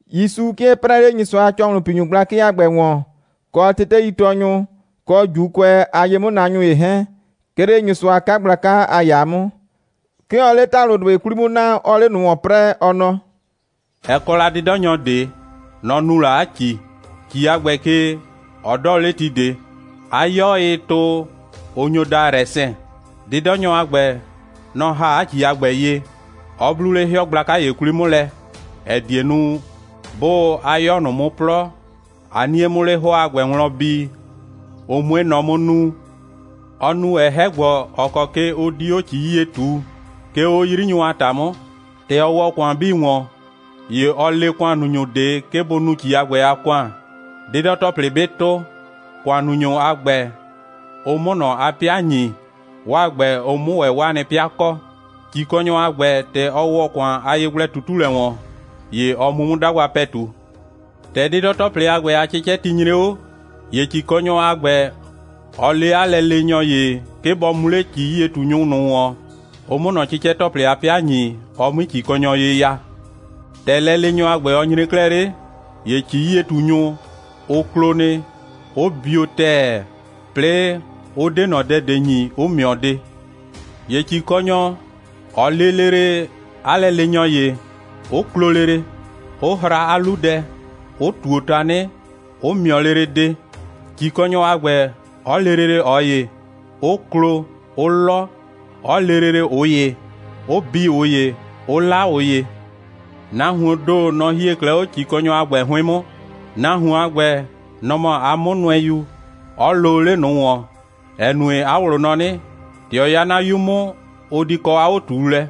(‑Yusu 'kɩɛ 'prɛɛ 'le Nyɩsʋa a ‑cɔhlʋnpinyʋ gblakɩ a ‑gbɛ ‑wɔn, kɔ teteitɔɔnyʋ, kɔ ‑Juukʋɛ a ye'mʋnaanyʋ ‑ye 'hɛɛn, 'ke 'le Nyɩsʋa a 'kagblaka a ‑yaa 'mʋ.) 'Ke ɔɔ 'le ‑talʋdʋɩ 'kwli 'mʋ naa, 'ɔɔ 'le ꞊nʋ ‑wɔn 'prɛɛ, ɔ nɔ: «Ɛ kɔ la 'dɩdɔnyɔ ꞊de. Nɔ‑ nu la 'a ‑ci. ‑Ci a ‑gbɛ ke, ɔ 'dɔɔ 'le ti ꞊de. 'A 'yɔ, ɩɩ tʋ, ʋ nyo daa rɛsɛn. 'Dɩdɔnyɔ a ‑gbɛ, nɔ‑ ‑ha 'a ‑ci a ‑gbɛ ye, 'ɔ 'blu 'le 'hɩɔ gblaka ‑ye 'kwli 'mʋ lɛ, ‑ɛ die nu, 'bʋʋ 'a 'yɔ ꞊nʋ 'mʋ 'plɔ, 'a 'nie 'mʋ 'le 'hʋɔ a ‑gbɛ wlɔn bi, ʋ 'mue nɔ 'mʋ nuu. Ɔ nu ‑wɛ 'hɛ‑gbɔ, ‑ɔ kɔ ke ʋ di 'o ‑ci 'yie ꞊tuu, 'ke 'o 'yrinyʋ a ‑ta 'mʋ. ‑Tɛ ɔ ‑wɔ ‑kʋan 'bii ‑wɔn, ‑ye ɔ le ‑kʋannunyʋ ꞊de, 'ke bʋ nu ‑ci a ‑gbɛ a ‑kʋan, 'dɩdɔ‑tɔplɩ 'bɩ tʋ, ‑kʋannunyʋ a ‑gbɛ, ʋ 'mʋ ꞊nɔ 'a 'pɩa ‑nyi, 'waa ‑gbɛ, ʋ 'mʋ ‑wɛ 'o 'waa nɩ 'pɩa kɔ. ‑Cikɔnyɔ a ‑gbɛ, ‑tɛ ɔ ‑wɔ ‑kʋan a yegblɛ꞊tutulɛ ‑wɔn, ‑ye ɔ mu 'mʋ 'dagba ‑pɛtu. ‑Tɛ 'dɩdɔ‑tɔplɩ a 'cɩcɛti nyre 'o, ‑ye ‑cikɔnyɔ a ‑gbɛ, ɔ le 'a lɛleenyɔ ‑ye, 'ke bɔ mu 'le ‑ci'yie꞊tunyʋ ꞊nʋ ‑wɔn, ʋ 'mʋ ꞊nɔ 'cɩcɛ‑tɔplɩ a 'pɩa ‑nyi, ɔ 'mui ‑cikɔnyɔ ye ya. ‑Tɛ lɛleenyɔ a ‑gbɛ, ɔ nyre 'klɛɛ 'le, ‑ye ‑ci'yie꞊tunyʋ, ʋ klo nɩ, 'ʋ bio ‑tɛɛ, 'plɩɩ, ʋ 'de ꞊nɔ dɛ ꞊de ‑nyi, 'ʋ ‑mɩɔ de. ‑Ye ‑cikɔnyɔ, ɔ lee lele 'a lɛleenyɔ ‑ye, 'ʋ klo lele, 'ʋ hra 'a 'lu dɛ, 'ʋ ꞊tuo tanɩ, 'ʋ ‑mɩɔ lele de, ‑cikɔnyɔ a ‑gbɛ, 'ɔ le lele ꞊ɔ ‑ye, 'ʋ klo, 'ʋ 'lɔ, 'ɔ le lele ꞊ʋ ‑ye, 'ʋ bi ꞊ʋ ‑ye, 'ʋ 'la ꞊ʋ ‑ye. Nahuoon ‑do, nɔ‑ hie 'klɛɛ 'o ‑cikɔnyɔ a ‑gbɛ 'hʋɩn 'mʋ. Nahuon a ‑gbɛ, nɔ‑ mɔ 'a 'mʋnʋɛyu, 'ɔ loo 'le ꞊nʋ ‑wɔn, ‑ɛ nue, 'a ꞊wlʋ nɔ 'nɩ: ‑Tɛ ɔ 'ya 'na 'yu 'mʋ, ʋ di kɔ 'a 'o꞊tuulɛ.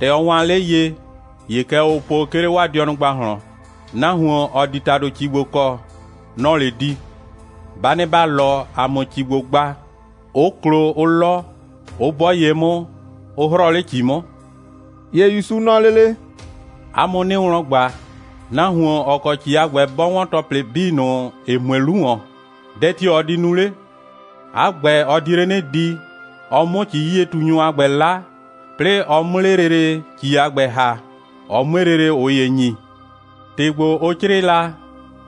‑Tɛ ɔ waan 'le ye, ‑ye kɛ ʋʋ po, 'ke 'le 'waa dɩɔnʋ ‑gbahlɔn: Nahuon, ‑ɔ di ‑tado ‑ci ‑gbo kɔ, nɔ‑ɔ 'le di. Ba nɩ ‑ba 'lɔ, ‑a 'mʋ ‑ci ‑gbo gba, 'ʋ klo, 'ʋ 'lɔ, 'ʋ 'bɔ ye 'mʋ, 'ʋ 'hrɔɔ 'le ‑ci 'mʋ.» ‑Ye ‑Yusu nɔ lele: «'A mʋ 'nɩɩ wlɔn ꞊gba, nahuon, ‑ɔ kɔ ‑ci a ‑gbɛ, 'bɔ 'wɔn ‑tɔplɩ 'bii ꞊nʋ, ‑ɩ mue 'lu ‑wɔn, dɛ tio‑ ɔ di nu 'le? 'A ‑gbɛ, ɔ di 'le 'nɩ di, ɔ 'mʋ ‑ci'yie꞊tunyʋ a ‑gbɛ 'la, 'plɩɩ ɔ 'mʋ 'le lele ‑ci a ‑gbɛ ‑ha, ɔ 'mue lele ꞊ʋ ‑ye ‑nyi. ‑Tɩ ‑gbo, ʋ 'crɩɩ la,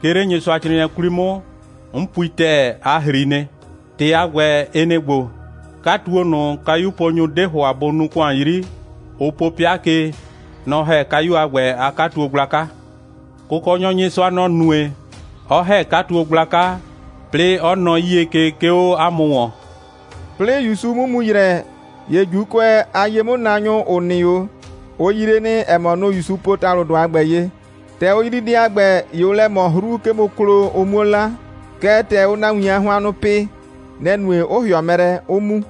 'ke 'le Nyɩsʋacrɩɩnɩɛ 'kwli 'mʋ, 'n pui ‑tɛɛ, a ‑hri nɩ. ‑Tɩ a ‑gbɛ, ɩ nɩ‑ ‑gbo: 'Katuo ꞊nʋ, kayuponyʋ 'de ‑hʋa bʋ nuu ‑kʋan 'yri, ʋ po 'pɩa ke, nɔ‑ ‑hɛ kayu a ‑gbɛ a 'katuo gblaka. Kʋkɔnyɔ Nyɩsʋa, nɔ‑ nue, 'ɔ ‑hɛ 'katuo gblaka, 'plɩɩ 'ɔ nɔɔ 'yie ke, 'ke 'o ‑a mʋ ‑wɔn.» 'Plɩɩ ‑Yusu 'mʋ mu ‑yrɛ, ‑ye ‑Juukʋɛ a ye'mʋnaanyʋ, ‑ʋ nɩ 'o, ʋ yree nɩ, ‑ɛ mɔ, nʋ‑ ‑Yusu po ‑talʋdʋ a ‑gbɛ ye. ‑Tɛ ʋ yrii dɛ a ‑gbɛ, ‑ye ʋʋ lɛ ꞊mɔ 'hru, 'ke bʋ klo, ʋ 'muo 'la. Kɛɛ, ‑tɛ ʋʋ nahuin a hʋannʋ pɩ, nɛ‑ nue, 'ʋ ‑hɩɔ mɛ lɛ, 'ʋ mu.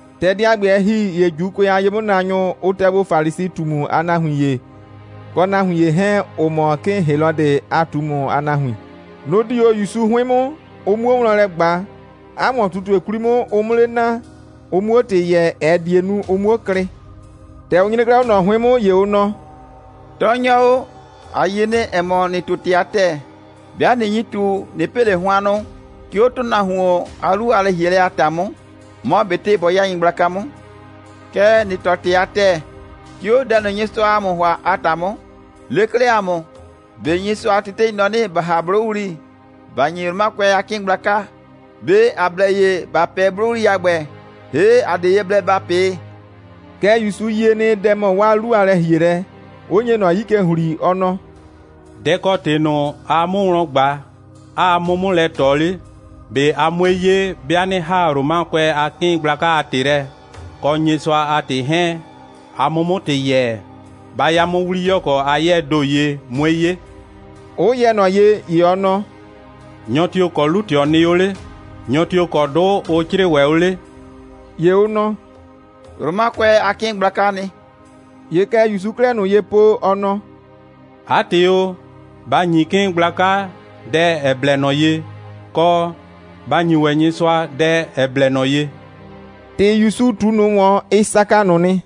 ‑Tɛ dɛ a ‑gbɛ, ɛ ‑hi, ‑ye ‑Juukʋɛ a ye'mʋnaanyʋ, ʋ tɛ gbo Falisi꞊tumu a nahuin ‑ye, kɔ nahuin ‑ye 'hɛɛn, ‑ʋ mɔ 'kɩɩn Helɔdɩ a ꞊tumu a nahuin. Nʋ‑ di 'o ‑Yusu 'hʋɩn 'mʋ, ʋ 'muo wlɔn lɛ ꞊gba, 'a ‑wɔn꞊tutue 'kwli 'mʋ, ʋ 'mʋ 'le naa, ʋ 'muo ‑tɩ yɛɛ, ‑ɛ die nu, ʋ 'muo klɩ. ‑Tɛ ʋ nyre 'klɛɛ 'o ꞊nɔ 'hʋɩn 'mʋ, ‑ye ʋ nɔ: «Tɔɔnyɔ o, ‑a yie nɩ, ‑ɛ mɔ, ‑nɩɩ ꞊tu ‑tɩ a ‑tɛɛ. 'Bɩa ꞊nɩ nyi ꞊tu, ꞊nɩ pɩ ꞊le hʋannʋ, 'ke 'o ‑tʋnahuon a 'lu a lɛ‑hielɛ a ‑ta 'mʋ, mɔ ꞊betɩ bɔ 'ya nyɩgblaka 'mʋ. Kɛɛ, ‑nɩɩ tɔɔ ‑tɩ a ‑tɛɛ, 'ke 'o dɛ ꞊nʋ, Nyɩsʋaa ‑a mʋ ‑hʋa a ‑ta 'mʋ. Le 'klɛɛ ‑a mʋ, ꞊be Nyɩsʋa a tetei nɔ 'nɩ, ‑ba ‑ha 'blʋwli, ‑ba ‑nyi Romakʋɛ a 'kɩɩn gblaka. ꞊Be ‑a blɛ ye ‑ba 'pɛɛ 'blʋwli a ‑gbɛ, ‑hee' ‑a 'de ye blɛ ‑ba 'pɩɩ?» Kɛɛ ‑ye ‑Yusu yie nɩ, dɛ‑ mɔ 'waa 'lu a lɛ‑hielɛ, 'ʋ nye ꞊nɔ 'yi ke ‑hli, ɔ nɔ: «Dɛ‑ kɔ ‑tɩ ꞊nʋ, aa 'mʋ wlɔn ꞊gba, 'aa 'mʋ 'mʋ lɛ ꞊tɔ 'le? ꞊Be a 'mue 'ye, 'bɩa 'nɩ ‑haa Romakʋɛ a 'kɩɩn gblaka a ‑tɩ lɛ, kɔ Nyɩsʋa a ‑tɩ 'hɛɛn, a 'mʋ 'mʋ ‑tɩ yɛɛ? Ba ya 'mʋ 'wliyɔkɔ a 'yɛɛ ‑do ye, 'mue 'ye,» 'ʋ yɛ ꞊nɔ ye. ‑Ye ɔ nɔ: «Nyɔ tio‑ kɔ 'lu꞊tɩɔ nɩ 'o 'le? Nyɔ tio‑ kɔ 'dʋ ʋ 'crɩɩ ‑wɛ 'o 'le?» ‑Ye ʋ nɔ: «Romakʋɛ a 'kɩɩn gblakaa nɩ.» ‑Ye kɛ ‑Yusuu 'klɛɛ ꞊nʋ ye po, ɔ nɔ: «'A ‑tɩ o, ba ‑nyi 'kɩɩn gblaka dɛ, ‑ɛ blɛ ꞊nɔ ye, kɔ, ba ‑nyi ‑wɛ Nyɩsʋa dɛ, ‑ɛ blɛ ꞊nɔ ye!» ‑Tɩ ‑Yusu ꞊tu ꞊nʋ ‑wɔn, ɩ saka ꞊nʋ nɩ.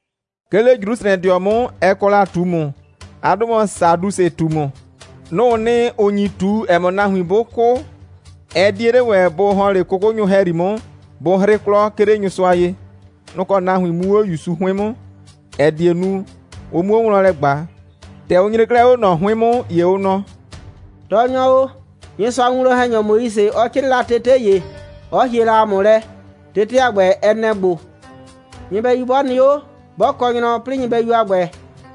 'Ke 'le Jrusrɛdɩɔ 'mʋ, ɛ kɔ la ꞊tumu. 'A 'dʋ mɔ Sadusɩ꞊tumu. Nʋ‑ʋ nɩ, ‑ʋ nyi ꞊tu, ‑ɛ mɔ, nahuin 'bʋ 'kʋ, ɛ 'die 'le ‑wɛ bʋ ‑hɔn 'le 'kʋkʋnyʋ ‑hɛyri 'mʋ, bʋ 'hrɩ 'klɔ, 'ke 'le Nyɩsʋa ye. Nʋ‑ kɔ nahuin mu 'o ‑Yusu 'hʋɩn 'mʋ, ‑ɛ die nu, ʋ 'muo wlɔn lɛ ꞊gba. ‑Tɛ ʋ nyre 'klɛɛ 'o ꞊nɔ 'hʋɩn 'mʋ, ‑ye ʋ nɔ: «Tɔɔnyɔ o, Nyɩsʋa a winwlɔn‑hɛnyɔ Moise, ɔ 'crɩɩ la tete ‑ye, 'ɔ hie la ‑a mʋ lɛ. Tete a ‑gbɛ, ɛ nɛ‑ ‑gbo: Nyɩbɛyu 'bɔ nɩ 'o, 'bɔ kɔ nyrɔ, 'plɩɩ nyɩbɛyu a ‑gbɛ,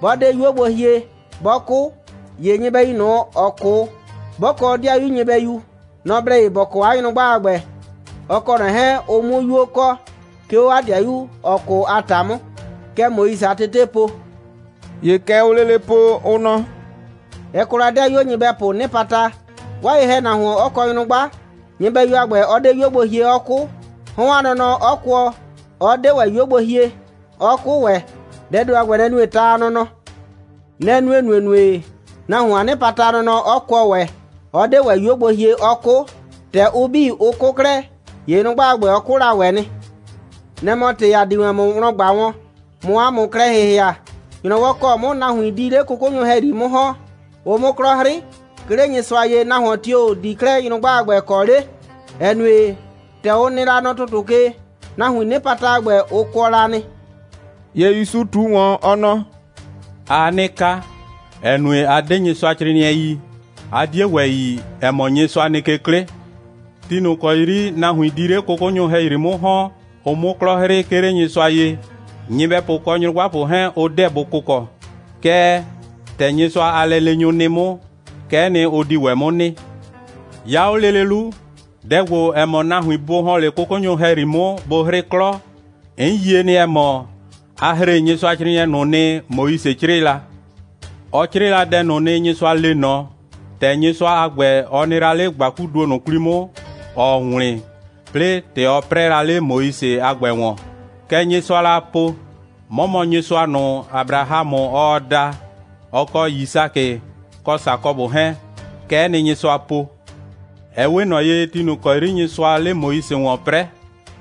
'bɔ 'de 'yuo gbo hie, 'bɔ 'kʋ, ‑ye nyɩbɛyu ꞊nʋ, ‑ɔ 'kʋ, 'bɔ kɔ 'dɩayu nyɩbɛyu, nɔ‑ blɛ ye ‑bɔ kɔ 'a nyrʋgba a ‑gbɛ, ɔ kɔ ꞊nɔ 'hɛɛn, ʋ 'mʋ 'yuo kɔ, 'ke 'o 'a 'dɩayu, ‑ɔ 'kʋ a ‑ta 'mʋ. Kɛ Moise a tetee po.» ‑Ye kɛ ʋʋ lele po, ʋ nɔ: «Ɛ kɔ la ‑dɩayuo nyɩbɛpʋʋ 'nɩpata, 'waa ye‑hɛnahuon 'ɔ kɔ nyrʋgba, nyɩbɛyu a ‑gbɛ 'ɔ 'de 'yuo gbo hie, 'ɔ 'kʋ, 'hɔn a nɔnɔ 'ɔ kʋɔ, 'ɔ 'de ‑wɛ 'yuo gbo hie, 'ɔ 'kʋ ‑wɛ. Dɛɛ ‑do a ‑gbɛ, nɛ‑ nue ta a nɔnɔ. Nɛ‑ nue ‑nuenue, nahuon a 'nɩpata a nɔnɔ 'ɔ kʋɔ ‑wɛ, 'ɔ 'de ‑wɛ 'yuo gbo hie, 'ɔ 'kʋ. ‑Tɛ ʋ 'bii, ʋ 'kʋ 'klɛɛ, ‑ye nyrʋgba a ‑gbɛ, ɔ 'kʋ la ‑wɛ nɩ. Nɛ‑ mɔ ‑tɩ, ‑a di wɛn ‑mʋ wlɔn ꞊gba wɔn, ꞊mʋ ‑a mʋ klɛ ‑hɩhɩa. ‑Nyrɔwɔ ‑kɔ 'mʋ nahuin di 'le 'kʋkʋnyʋ ‑hɛyri 'mʋ ‑hɔn, ʋ 'mʋ 'klɔ 'hrɩ, 'ke 'le Nyɩsʋa ye, nahuon tio‑ di 'klɛɛ nyrʋgba a ‑gbɛ kɔ 'le, ‑ɛ nue, ‑tɛ ʋ nɩ la nɔ ‑tʋtʋ ke, nahuiin 'nɩpata a ‑gbɛ, ʋ kʋɔ la nɩ.» ‑Ye ‑Yusu ꞊tu ‑wɔn, ɔ nɔ: «Aa 'nɩ ka, ‑ɛ nue, a 'de Nyɩsʋacrɩɩnɩɛ yi, 'a 'die ‑wɛ yi, ‑ɛ mɔ, Nyɩsʋa nɩ ke 'klɩ. Ti ꞊nʋ ‑kɔ 'yri nahuin di 'le 'kʋkʋnyʋ ‑hɛyri 'mʋ ‑hɔn, ʋ 'mʋ 'klɔ 'hrɩ, 'ke 'le Nyɩsʋa ye, nyɩbɛpʋ kɔ nyrʋgbapʋ 'hɛɛn, ʋ 'deɛ bʋ kʋkɔ. Kɛɛ, ‑tɛ Nyɩsʋa a lɛleenyʋ nɩ 'mʋ, kɛ'ɛ nɩ, ʋ di ‑wɛ 'mʋ nɩ. 'Ya 'o lele 'lu, dɛ ‑gbo, ‑ɛ mɔ nahuin bʋ ‑hɔn 'le 'kʋkʋnyʋ ‑hɛyri 'mʋ, bʋ 'hrɩ 'klɔ, 'n yie nɩ, ‑ɛ mɔ, a ‑hre Nyɩsʋacrɩɩnɩɛ ꞊nʋ nɩ, Moise 'crɩɩ la. Ɔ 'crɩɩ la dɛ ꞊nʋ nɩ, Nyɩsʋa le ꞊nɔ, ‑tɛ Nyɩsʋa a ‑gbɛ, ɔ nɩ la 'le ‑gbakuduo ꞊nʋ 'kwli 'mʋ, ‑ɔɔ wlɩn, 'plɩɩ ‑tɛ ɔ 'prɛɛ la 'le Moise a ‑gbɛ ‑wɔn. Kɛ Nyɩsʋaa la po: 'Mɔ mɔ Nyɩsʋa ꞊nʋ, Abrahamʋ, ɔɔ da, ɔ kɔ Yisakɩ, kɔ Sakɔbʋ 'hɛɛn. Kɛ'ɛ nɩ, Nyɩsʋa po. Ɛ 'we ꞊nɔ ye, ti ꞊nʋ ‑kɔ 'yri Nyɩsʋaa 'le Moise ‑wɔn 'prɛɛ,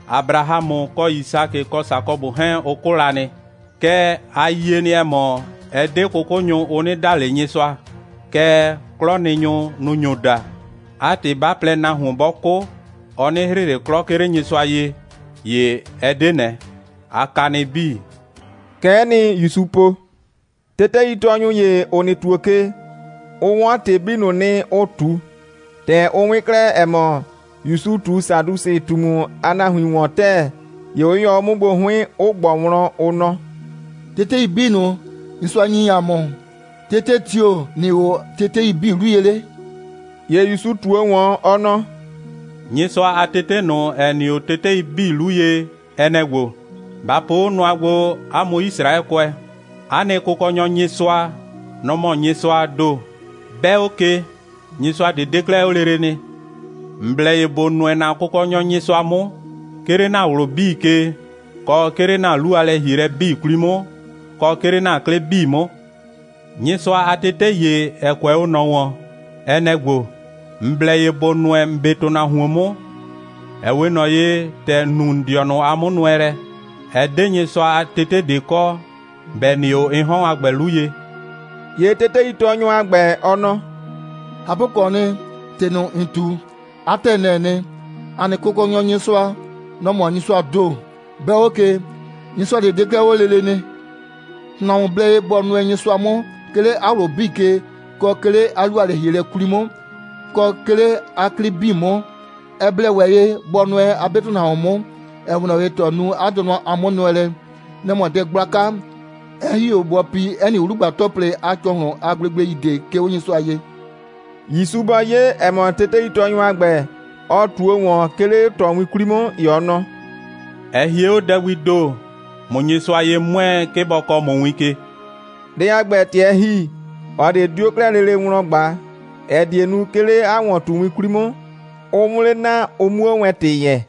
Abrahamʋ kɔ Yisakɩ kɔ Sakɔbʋ 'hɛɛn, ʋ 'kʋ la nɩ. Kɛɛ, ‑a yie nɩ, ‑ɛ mɔ, ɛ 'de 'kʋkʋnyʋ, ʋ 'nɩ da ꞊le Nyɩsʋa, kɛɛ, 'klɔnɩnyʋ, nʋ‑ nyo da. 'A ‑tɩ, 'ba plɛ, nahuon 'bɔ 'kʋ, ɔ 'nɩ 'hrɩ ꞊le 'klɔ, 'ke 'le Nyɩsʋa ye, ‑ye ɛ 'de ꞊nɛ. A ka nɩ 'bii.» Kɛ'ɛ nɩ, ‑Yusu po. Teteitɔɔnyɔ ‑ye, ‑ɔ nɩ ‑tuo ke, ɔ 'wɔn ‑tɩ 'bii ꞊nʋ nɩ, ʋ ꞊tu. ‑Tɛ ɔ 'wɩn 'klɛɛ, ‑ɛ mɔ, ‑Yusu ꞊tu Sadusɩ꞊tumu a nahuin ‑wɔn ‑tɛɛ, ‑ye ɔ 'yɩyɔ 'o 'mʋ gbo 'hʋɩn, 'ɔ ꞊gbɔ wlɔn, ɔ nɔ: «Tetei 'bii ꞊nʋ, Nyɩsʋa ‑nyi ‑a mʋ, tete tio‑ nɩ 'o tetei 'bii 'lu ye 'le?» ‑Ye ‑Yusu ꞊tuo ‑wɔn, ɔ nɔ: «Nyɩsʋa a tete ꞊nʋ, ‑ɛ nɩ 'o tetei 'bii 'lu ye, ɛ nɛ‑ ‑gbo: Ba po 'o nʋa gbo, 'a mʋ Yisraɛkʋɛ: ‑A nɩ Kʋkɔnyɔ Nyɩsʋa, nɔ‑ mɔ Nyɩsʋaa ‑do. 'Bɛɛ 'o ke, nyɩsʋa ꞊de 'de 'klɛɛ 'o lele nɩ. ‑N blɛ ye ‑bo nʋɛ ‑na Kʋkɔnyɔ Nyɩsʋa 'mʋ, 'ke 'le ‑na ꞊wlʋ 'bii ke, kɔ 'ke 'le ‑na 'lu a lɛ‑hielɛ 'bii 'kwli 'mʋ, kɔ 'ke 'le ‑na 'klɩ 'bii 'mʋ. Nyɩsʋa a tete ‑ye, ‑ɛ kʋɛ 'o ꞊nɔ ‑wɔn, ɛ nɛ‑ ‑gbo: ‑N blɛ ye ‑bo nʋɛ ‑n 'be ‑tʋnahuon 'mʋ, ‑ɛ 'we ꞊nɔ ye, ‑tɛ ‑n nu ‑n dɩɔnʋ a 'mʋnʋɛlɛ. Ɛ 'de Nyɩsʋa a tete ꞊de kɔ, ‑bɛ nɩ 'o ɩ 'hɔn a ‑gbɛ 'lu ye.» ‑Ye teteitɔɔnyɔ a ‑gbɛ, ɔ nɔ: «꞊Hapʋkɔɔ nɩ, ‑tɩ ꞊nʋ, ‑n ꞊tu, 'a ‑tɛɛ, nɛ‑ɛ nɩ. ‑A nɩ Kʋkɔnyɔ Nyɩsʋa, nɔ‑ mɔ Nyɩsʋaa ‑do. 'Bɛɛ 'o ke, Nyɩsʋa ꞊de 'de 'klɛɛ 'o lele nɩ. ‑Tʋnahuon blɛ ye bɔ nʋɛ Nyɩsʋa 'mʋ, 'ke 'le 'a ꞊wlʋ 'bii ke, kɔ 'ke 'le 'a 'lu a lɛ‑hielɛ 'bii 'kwli 'mʋ, kɔ 'ke 'le 'a 'klɩ 'bii 'mʋ. Ɛ blɛ ‑wɛ ye bɔ nʋɛ 'a 'be ‑tʋnahuon 'mʋ, ‑ɛ 'we ꞊nɔ ye, ‑tɛ ɔ nu 'a dɩɔnʋ a 'mʋnʋɛlɛ. Nɛ‑ mɔ dɛ gblaka, 'ɛ ‑hi 'o bɔ pi 'ɛ nɩ 'wlugba‑tɔplɩ a ‑cɔhlʋn a gblegblei ꞊de, 'ke 'o Nyɩsʋa ye.» ‑Yusu bɔ 'ye, ‑ɛ mɔ, teteitɔɔnyɔ a ‑gbɛ, ɔ ꞊tuo ‑wɔn, 'ke 'le ꞊tɔ 'kwli 'mʋ, ‑ye ɔ nɔ: «Ɛ hie 'o dɛ gbii ‑do, ꞊mʋ Nyɩsʋa ye 'mʋɛɛ, 'ke bɔ kɔɔ ‑mʋ win ke.» Dɛ a ‑gbɛ, ‑tɛ ɛ ‑hi, ꞊ɔ ꞊de 'dio 'klɛɛ lele dɛ wlɔn ꞊gba, ‑ɛ die nu, 'ke 'le 'a ‑wɔn꞊tuwin 'kwli 'mʋ, ʋ 'mʋ 'le naa, ʋ 'muo wɛn ‑tɩ yɛɛ.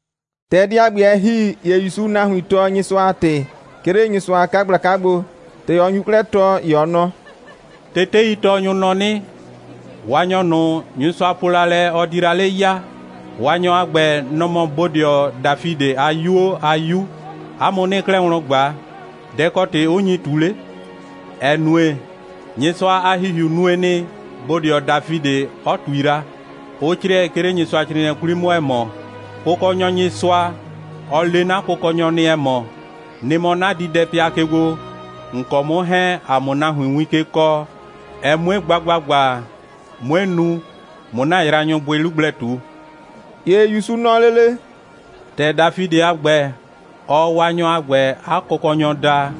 ‑Tɛ dɛ a ‑gbɛ, ɛ ‑hi, ‑ye ‑Yusuu nahuin tɔɔ Nyɩsʋa a ‑tɩ, 'ke 'le Nyɩsʋa a 'kagblaka gbo. ‑Tɛ ɔ nyu 'klɛɛ tɔɔ, ‑ye ɔ nɔ: «Teteitɔɔnyʋ nɔ 'nɩ: Waanyɔ ꞊nʋ, Nyɩsʋa po la lɛ, ɔ di la 'le ya, Waanyɔ a ‑gbɛ, nɔ‑ mɔ bodɩɔ Dafidɩ a 'yuo a 'Yu. 'A mʋ 'nɩɩ 'klɛɛ wlɔn ꞊gba: Dɛ‑ kɔ ‑tɩ 'ʋ nyi ꞊tu 'le? ‑ɛ nue, Nyɩsʋa a ‑Hihiu nue nɩ, bodɩɔ Dafidɩ 'ɔ ꞊tui la, 'ʋ 'crɩɛ, 'ke 'le Nyɩsʋacrɩɩnɩɛ 'kwli 'mʋ, ‑ɛ mɔ: Kʋkɔnyɔ Nyɩsʋa, ɔ le 'na Kʋkɔnyɔ nɩ, ‑ɛ mɔ: Nɩ mɔ 'na diidɛpɩa ke gbo, ‑n kɔ 'mʋ 'hɛɛn, ‑a 'mʋ nahuin win ke kɔɔ, ɛ 'mue gba ‑gbagba, 'mue nu, ꞊mʋ ‑na yraanyʋ bʋɩ 'lu gblɛ ꞊tu.» ‑Ye ‑Yusu nɔ lele: «‑Tɛ Dafidɩ a ‑gbɛ, ɔɔ Waanyɔ a ‑gbɛ 'a Kʋkɔnyɔ daa,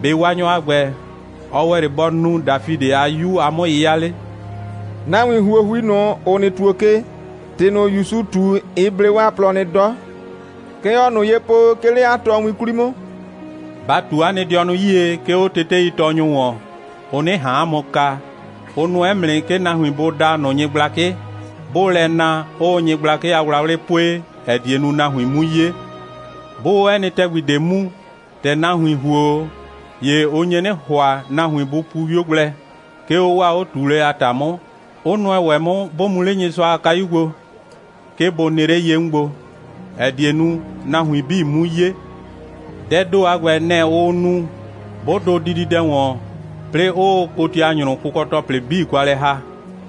‑be' Waanyɔ a ‑gbɛ, ɔ ‑wɛ 'le bɔ nu Dafidɩ a 'Yu a 'mʋ'yɩya 'le?» Nahuin ‑huohui ꞊nʋ, ‑ʋ nɩ ‑tuo ke, ‑tɩ ꞊nʋ, ‑Yusu ꞊tu, ɩ blee 'waa plɔ nɩ 'dɔ. Kɛ ɔɔ ꞊nʋ ye po, 'ke 'le 'a tɔɔwin 'kwli 'mʋ: «Ba ꞊tu 'a nɩ dɩɔnʋ 'yie, 'ke 'o teteitɔɔnyʋ ‑wɔn, ʋ 'nɩ ꞊han 'a mʋ kaa. Ʋ nʋɛ 'mʋ nɩ, 'ke nahuin bʋ daa ꞊nʋ nyɩgblakɩ. 'Bʋʋ lɛ na, 'ʋʋ nyɩgblakɩ a wlawlɩ pue, ‑ɛ die nu, nahuin 'mu 'ye. 'Bʋʋ 'o 'ɛ nɩ ‑tɛgbi ꞊de mu, ‑tɛ nahuin ‑huo 'o, ‑ye ʋ nye 'nɩ ‑hʋa, nahuin bʋ pu 'wio gblɛ, 'ke 'o 'waa 'o꞊tuulɛ a ‑ta 'mʋ, 'ʋ nʋɛ ‑wɛ 'mʋ, 'bʋ mu 'le Nyɩsʋa a kayu gbo, 'ke bʋ nɩ 'le ye 'mʋ gbo, ‑ɛ die nu, nahuin 'bii 'mu 'ye. Dɛɛ ‑do a ‑gbɛ, nɛ‑ ʋʋ nu, 'bʋ dʋ dididɛ ‑wɔn, 'plɩɩ, 'ʋʋ kotianyrʋ kʋkɔ‑tɔplɩ 'bii kwa lɛ ‑ha.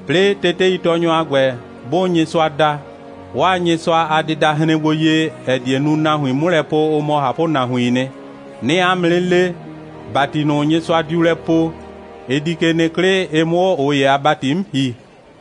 'Plɩɩ teteitɔɔnyʋ a ‑gbɛ, 'bʋʋ Nyɩsʋa da, 'waa Nyɩsʋa a dɩda hren gbo ye, ‑ɛ die nu, nahuin 'mʋ lɛ po, ʋ mɔ ꞊hapʋnahuiin nɩ. 'Nɩɩ 'a mʋ 'nɩ le, ‑bati ꞊nʋ Nyɩsʋa diu lɛ poo, ɩ di ke nɩ 'klɩ, ɩ 'mʋ 'o ꞊ʋ ‑ye a ‑bati 'mʋ ‑hi.»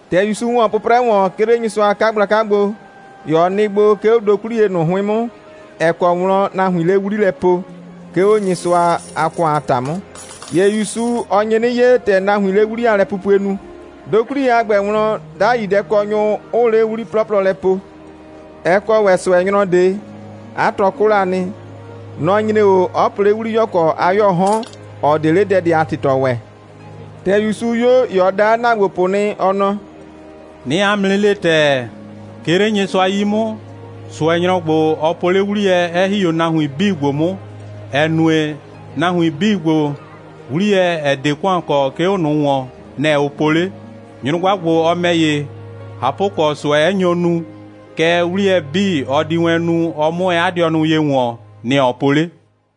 ‑Tɛ ‑Yusu ‑wɔ 'pʋprɛ ‑wɔn, 'ke 'le Nyɩsʋa a 'kagblaka gbo, ‑ye ɔ nɩ gbo, 'ke 'o dokwliye ꞊nʋ 'hʋɩn 'mʋ, ‑ɛ kɔ wlɔn nahuiin 'le 'wli lɛ po, 'ke 'o Nyɩsʋa a ‑kʋan a ‑ta 'mʋ. ‑Ye ‑Yusu, ɔ nye 'nɩ 'ye, ‑tɛ nahuiin 'le 'wli a lɛpupue nu. Dokwliye a ‑gbɛ wlɔn, 'dai dɛkɔnyʋ, 'ʋʋ 'le 'wli 'plɔplɔ lɛ po. Ɛ kɔ ‑wɛ ꞊sʋɛnyrɔ ꞊de. 'A tɔ 'kʋ la nɩ. Nɔ‑ nyre 'o, 'ɔ po 'le 'wliyɔkɔ a 'yɔɔ 'hɔn, ‑ɔ 'de 'le dɛ ꞊de a ‑tɩtɔ ‑wɛ. ‑Tɛ ‑Yusu 'yo, ‑ye ɔ da 'a ‑naagbopʋ nɩ, ɔ nɔ: «'Nɩɩ 'a mʋ 'nɩ le ‑tɛɛ, 'ke 'le Nyɩsʋa 'yi 'mʋ, ꞊sʋɛnyrɔ ‑gbo, ɔ po 'le 'wliyɛ, 'ɛ ‑hi 'o nahuin 'bii ‑gbo 'mʋ, ‑ɛ nue, nahuin 'bii ‑gbo, 'wliyɛ, ‑ɛ 'de ‑kʋan kɔ, 'ke 'o ꞊nʋ ‑wɔn, nɛ‑ ʋ po 'le. Nyrʋgba ‑gbo, ɔ ‑mɛ ‑ye, ꞊hapʋkɔ, ꞊sʋɛ 'ɛ nyo nu, kɛɛ, 'wliyɛ 'bii, ɔ di wɛn nu, ɔ 'mʋ wɛn 'a dɩɔ ye ‑wɔn, nɛ‑ ɔ po 'le.»